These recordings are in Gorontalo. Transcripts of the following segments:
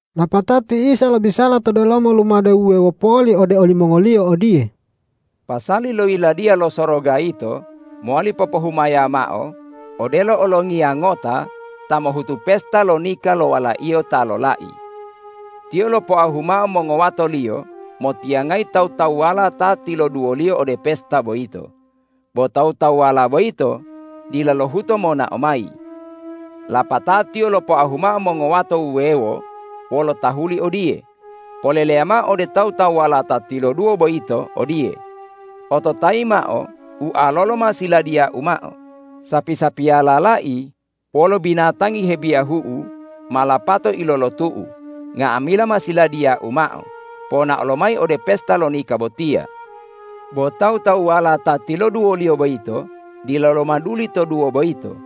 Lapatao ti Isa lobisala to delomo lumade wuwewo poli ode olimongoliyo odiye, ”Pasali lo Yiladiya lo Soroga yito mowali popohumaya mao odelo olongiya ngota ta mohutu pesta lo nika lo walaiyo ta lolai. Tiyo lopoahu mao mongowatoliyo motiyangayi tawu-tawuwala ta tiloduwoliyo ode pesta boyito, bo tawu-tawuwala boyito dila lohuto monao mayi. Lapatao tiyo lopoahu mao mongowato wuwewo wolo tahuli odiye, ’Poleleya mao ode tawu-tawuwala ta tiloduwo boyito odiye: Ototayi mao, ualolo ma siladiyau mao, sapi-sapiyala lai wolo binatangi hebiyahu'u ma lapato ilolotu'u; nga'amila ma siladiyau mao, ponao lomayi ode pesta lo nika botiya.’ Bo tawu-tawuwala ta tiloduwoliyo boyito dila lomaduli toduwo boyito.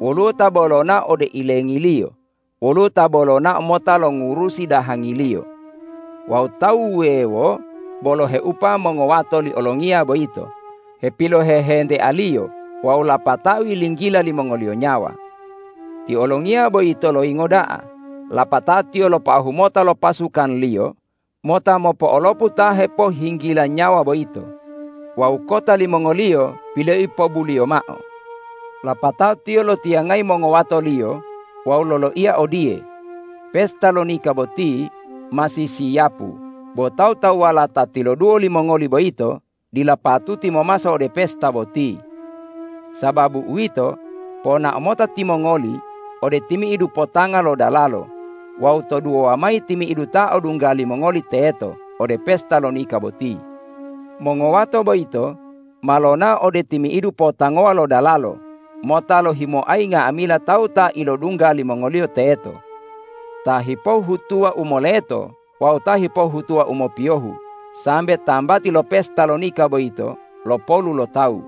Woluwo ta bo lonao ode ilengiliyo, woluwo ta bo lonao mota longurusi dahangiliyo. Wawu tawu wuwewo bo loheupa mongowato li olongiya boyito, hepilohehentealiyo wawu lapatao yilinggila limongoliyo nyawa. Ti olongiya boyito loyingo da'a. Lapatao tiyo lopoahu mota lo pasukanliyo mota mopo'olopu ta hepohhinggila nyawa boyito wawu kota limongoliyo piloipobuliyo mao. Lapatao tiyo lotiyangayi mongowatoliyo wawu loloiya odiye, ’Pesta lo nika boti ma sisiyapu bo tawu-tawuwala ta tiloduwo limongoli boyito dila patuti momaso ode pesta boti. Sababu uwito, ponao mota timongoli ode timi'idu potanga lo dalalo wawu toduwowa mayi timi'idu ta odungga limongoli teto ode pesta lo nika boti.’ Mongowato boyito ma lonao ode timi'idu potangowa lo dalalo mota lohimoayi nga'amila tawu ta ilodungga limongoliyo teto, ta hipohhutuwa u moleto wawu ta hepohhutuwa u mopiyohu, sambe tambati lo pesta lo nika boyito lopolu lo tawu.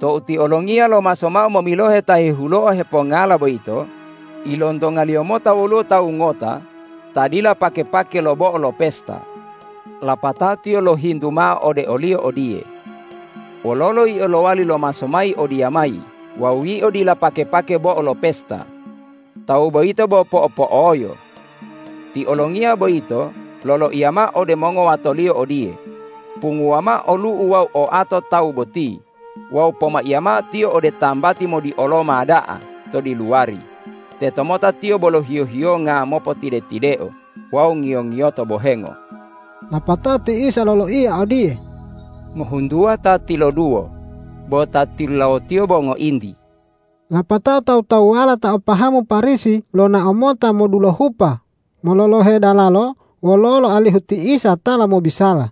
Tou ti olongiya lomaso mao momilohe ta hehuloa hepongala boyito, ilontongaliyo mota woluwo tawu ngota ta dila pake-pake lo bo'o lo pesta. Lapatao tiyo lohintu mao ode oliyo odiye, ’Wololo yio lowali lomaso mayi odiyamayi wawu yio dila pake-pake bo'o lo pesta?’ Tawu boyito bo po'o-po'oyo. Ti olongiya boyito loloiya mao ode mongowatoliyo odiye, ’Punguwa mao olu'u wawu oato tawu boti wawu pomaiya mao tiyo ode tambati modioloma da'a to diluwari, tetomota tiyo bolo hiyo-hiyonga mopotide-tideo wawu ngiyo-ngiyoto bohengo.’” Lapatao ti Isa loloiya odiye,”Ngohuntuwa ta tiloduwo bo ta tilulawotiyo bo ngointi.” Lapatao tawu-tawuwala ta o pahamu Parisi lonao mota modulohupa mololohe dalalo wololo alihu ti Isa tala mobisala.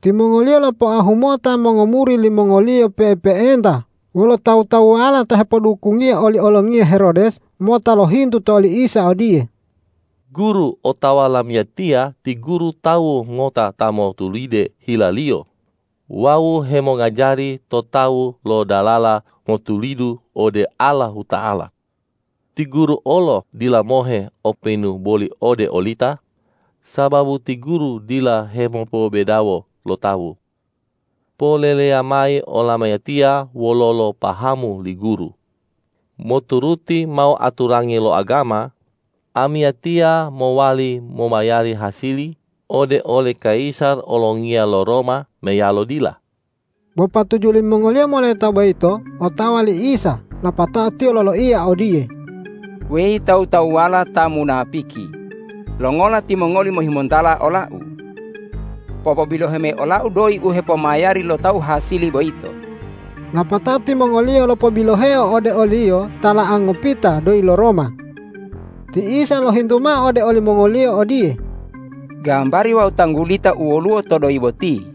Timongoliyo lopoahu mota mongomuri limongoliyo pe'epe'enta wolo tawu-tawuwala ta hepodukungiya oli olongiya Herodes mota lohintu to oli Isa odiye,”Guru, otawa lamiyatiya ti Guru tawu ngota ta motulide hila-Liyo wawu hemongajari to tawu lo dalala motulidu ode Allahuta'ala. Ti Guru olo dila mohe openu boli ode olita, sababu ti Guru dila hemopobedawo lo tawu. Poleleya mayi olamiyatiya wololo pahamu li Guru: Moturuti mao aturangi lo agama, amiyatiya mowali momayari hasili ode oli kayisar olongiya lo Roma meyalo dila?” Bo patuju limongoliyo moleta boyito otawa li Isa lapatao Tiyo loloiya odiye,”Weyi tawu-tawuwala ta munapiki, longola timongoli mohimontala ola-U? Popobilohe mayi ola-U doyi u hepomayari lo tawu hasili boyito.” Lapatao timongoliyo lopobiloheo ode o-Liyo tala'a ngopita doyi lo Roma. Ti Isa lohintu mao ode olimongoliyo odiye,”Gambari wawu tanggulita u woluwo to doyi boti?”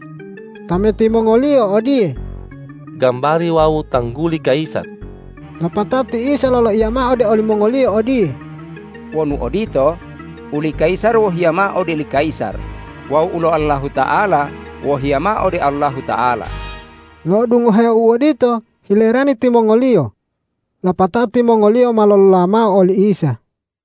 Tameti mongoliyo odiye,”Gambari wawu tangguli kayisar.” Lapatao ti Isa loloiya mao ode olimongoliyo odiye,”Wonu odito, uli kayisar wohiya mao ode oli kayisar wawu ulo Allahuta'ala wohiya mao ode Allahuta'ala.” Lo'odungohe u odito hilerani timongoliyo. Lapatao timongoliyo ma lolola mao oli Isa.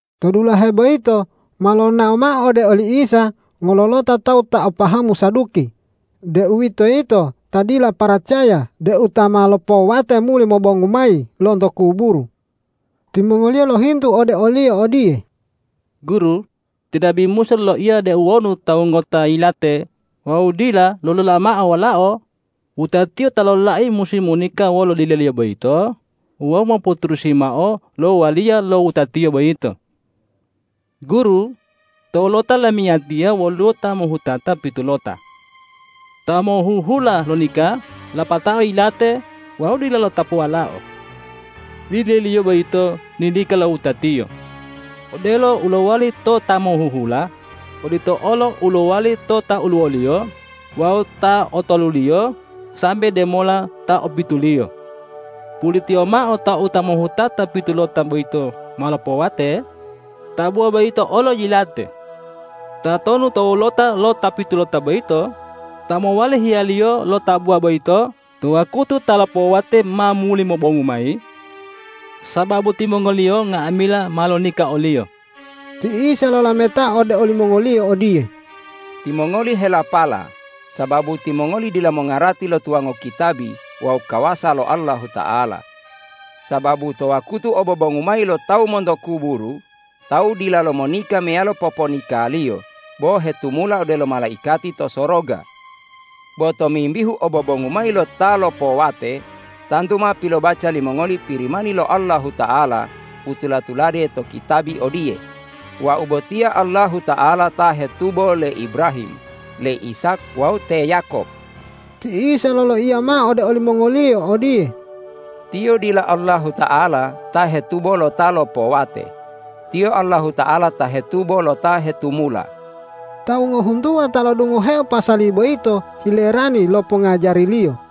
To dulahe boyito ma lonao mao ode oli Isa ngololota tawu ta o pahamu Saduki, deuwitoyito ta dila paracaya deu ta ma lopowate muli mobongu mayi lonto kuburu. Timongoliyo lohintu ode o-Liyo odiye, ”Guru, ti nabi Musa loloiya deu wonu tawu ngota yilate wawu dila lolola mao walao, wutatiyo ta lolai musi monika wolo dileliyo boyito wawu mopoturusi mao lo waliya lo wutatiyo boyito. Guru, to wolota lamiyatiya woluwo ta mohutata pitulota. Ta mohuhula lonika lapatao yilate wawu dila lo'otapu walao. Dileliyo boyito nilika lo wutatiyo. Odelo u lowali to ta mohuhula, odito olo u lowali to ta oluwoliyo wawu ta otoluliyo sambe demola ta opituliyo. Pulitiyo mao tou ta mohutata pitulota boyito ma lopowate, tabuwa boyito olo yilate. Tatonu to wolota lo ta pitulota boyito ta mowali hiyaliyo lo tabuwa boyito to wakutu ta lopowate ma muli mobongu mayi? Sababu timongoliyo nga'amila ma lonika oliyo.” Ti Isa lolametao ode olimongoliyo odiye,”Timongoli helapala, sababu timongoli dila mongarati lo tuwango kitabi wawu kawasa lo Allahuta'ala! Sababu to wakutu obobongu mayi lo tawu monto kuburu, tawu dilalo monika meyalo poponikaliyo bo hetumula odelo malaikati to soroga. Bo tomimbihu obobongu mayi lo ta lopowate, tantu ma pilobaca limongoli Pirimani lo Allahuta'ala u tula-tulade to kitabi odiye, ’Wau botiya Allahuta'ala ta hetubo le Ibrahim, le Ishak wawu te Yakob.’” Ti Isa loloiya mao ode olimongoliyo odiye,”Tiyo dila Allahuta'ala ta hetubo lo ta lopowate, Tiyo Allahuta'ala ta hetubo lo ta hetumula.” Tawu ngohuntuwa ta lo'odungoheo pasali boyito hilerani lo pongngajari-Liyo.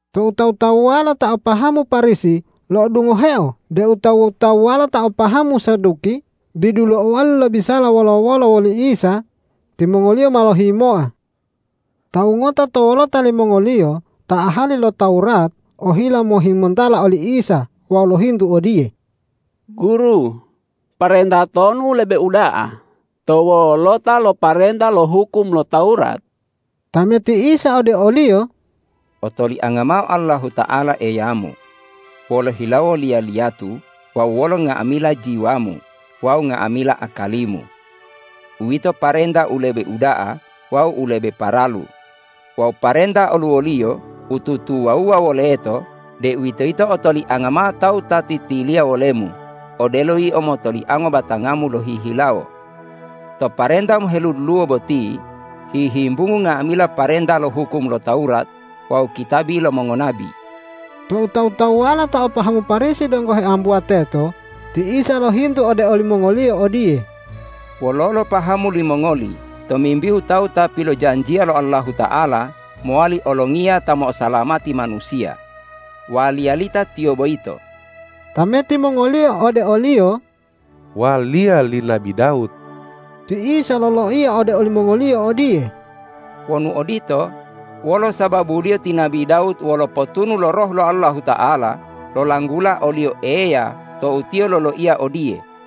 Tou tawu-tawuwala ta o pahamu Parisi lo'odungoheo deu tawu-tawuwala ta o pahamu Saduki didu lo'owali lobisala wolo-wolo woli Isa, timongoliyo ma lohimoa. Tawu ngota to wolota limongoliyo ta ahali lo Tawurat ohila mohimontala oli Isa wawu lohintu odiye, ”Guru, parenta tonu u lebe uda'a to wolota lo parenta lo hukum lo Tawurat?” Tameti Isa ode oliyo,”Otolianga mao Allahuta'ala Eyamu, wolo hilawo liya-liyatu wawu wolo nga'amila jiwamu wawu nga'amila akalimu. Uwito parenta u lebe uda'a wawu u lebe paralu. Wawu parenta oluwoliyo u tutuwa-wuwa woleto, deuwitoyito otolianga mao tawu ta titiliya wolemu odelo yio motoliango batangamu lohihilawo. To parenta moheduluwo boti hihimbungu nga'amila parenta lo hukum lo Tawurat wawu kitabi lo mongonabi.” Tou tawu-tawuwala ta o pahamu Parisi donggo heambuwa teto, ti Isa lohintu ode olimongoliyo odiye, ”Wololo pahamu limongoli tomimbihu tawu Ta pilojanjiya lo Allahuta'ala mowali olongiya ta mo'osalamati manusiya? Waliya lita Tiyo boyito?” Tameti mongoliyo ode o-Liyo,”Waliya li nabi Dawud.” Ti Isa loloiya ode olimongoliyo odiye,”Wonu odito, wolo sababuliyo ti nabi Dawud wolo potunu lo Roh lo Allahuta'ala lolanggula o-Liyo Eya tou tiyo loloiya odiye,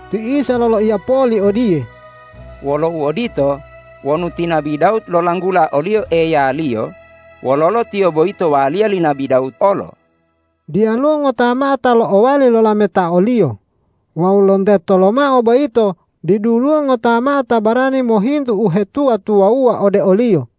Ti Isa loloiyo poli odiye,”Wolo uodito, wonu ti nabi Dawud lolanggula o-Liyo Eyaliyo, wololo Tiyo boyito waliya li nabi Dawud olo?” Diyaluwo ngota mao ta lo'owali lolameta o-Liyo wawu lonteto lomao boyito diduluwo ngota mao ta barani mohintu uhetuwa-tuwawuwa ode o-Liyo.